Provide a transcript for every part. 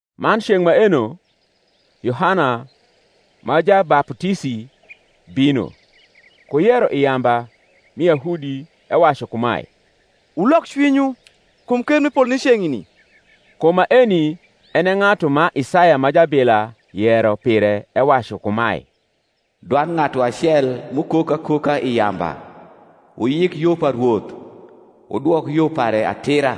Man ceng’ maeno Yohana ma Jabaputisi bino, ku yero i yamba mi Yahudi, ewacu kumae, Wulok cwinywu; kum ker mi polo ni ceng’ni. Kum maeni en e ng’atu ma Isaya ma jabila yero pire ewacu kumae, Dwand ng’atu acel m’ukok akoka i yamba, Wuyik yo pa Rwoth, Wudwok yo pare atira.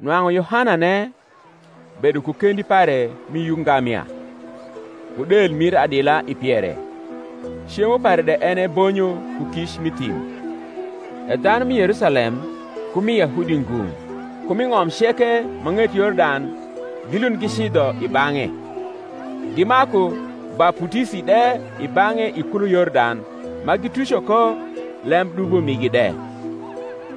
Nwang’u Yohanane bedo ku kendi pare mi yuk ngamia, ku del mir adila i piere; cemo pare de en e bonyo ku kic m’i thim. E dhanu mi Yerusalem, ku mi Yahudi ngung’, ku mi ng’om ceke ma ng’et Yordan gilund gicidho i bang’e; gimaku baputisi de i bang’e i kulo Yordan, ma gituco ko lemdubo migi de.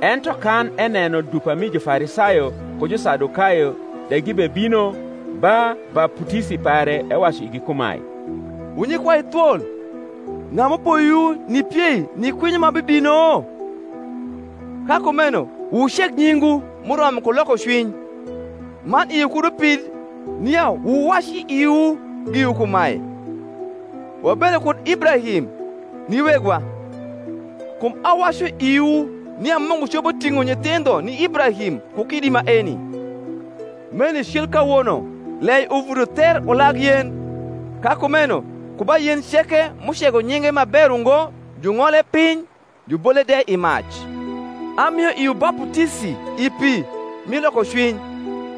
Ento kan eneno dupa mi Jufarisayo ku Jusadukayo de gibebino ba baputisi pare, ewacu igi kumae, Wu nyikwai thwol, ng’a m’upoyowu nipiei ni kwinyo ma bibino? Ka kumeno wuceg nyingwu m’uromo ku lokocwiny: man iwu kud upid nia wuwac i iwu giwu kumae, Wabedo kud Ibrahim ni wegwa: kum awacu iwu, nia Mungu copo ting’o nyithindho ni Ibrahim ku kidi maeni. Meni cil kawono lei uvuto ther ulag yen: ka kumeno ku ba yen ceke m’ucego nyinge ma ber ungo jung’ole piny, jubole de i mac. Amio iwu baputisi i pi mi lokocwiny: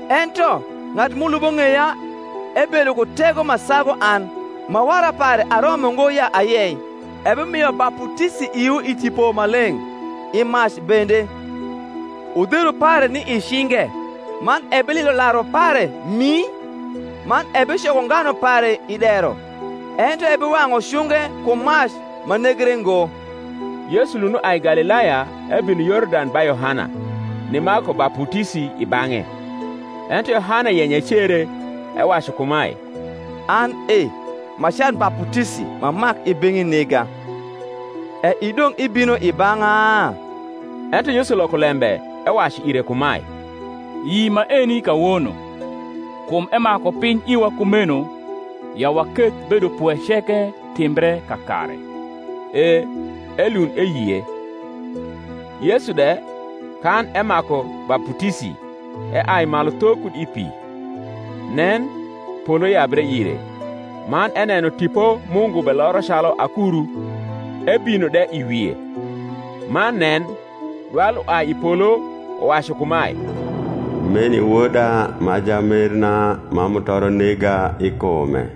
ento ng’atu m’ulubo ng’eya ebedo ku tego ma sagu an, ma wara pare aromo ngo ya ayei: ebimio baputisi iwu i Tipo Maleng’ i mac bende: udheru pare ni i cinge, man ebililo laru pare mii; man ebicoko nganu pare i dero, ento ebiwang’u cunge ku mac ma negre ngo. Yesu lund uai Galilaya ebino Yordan ba Yohana, nimaku baputisi i bang’e. Ento Yohana yenyo ecere, ewacu kumae, An e ma can baputisi m’amak i beng’i nega, e idong’ ibino i bang’a? Ento Yesu loko lembe ewacu ire kumae, Yi maeni kawono: kum emaku piny iwa kumeno ya waketh bedopwe ceke timbre kakare. E elund eyie. Yesu de, kan emaku baputisi, eai malu tho kud i pi: nen, polo yabre ire, man eneno Tipo Mungu beloro calu akuru, ebino de i wie; man nen, dwal uai i polo, uwacu kumae, Meni Woda ma jamerna, ma mutoro nega i kume.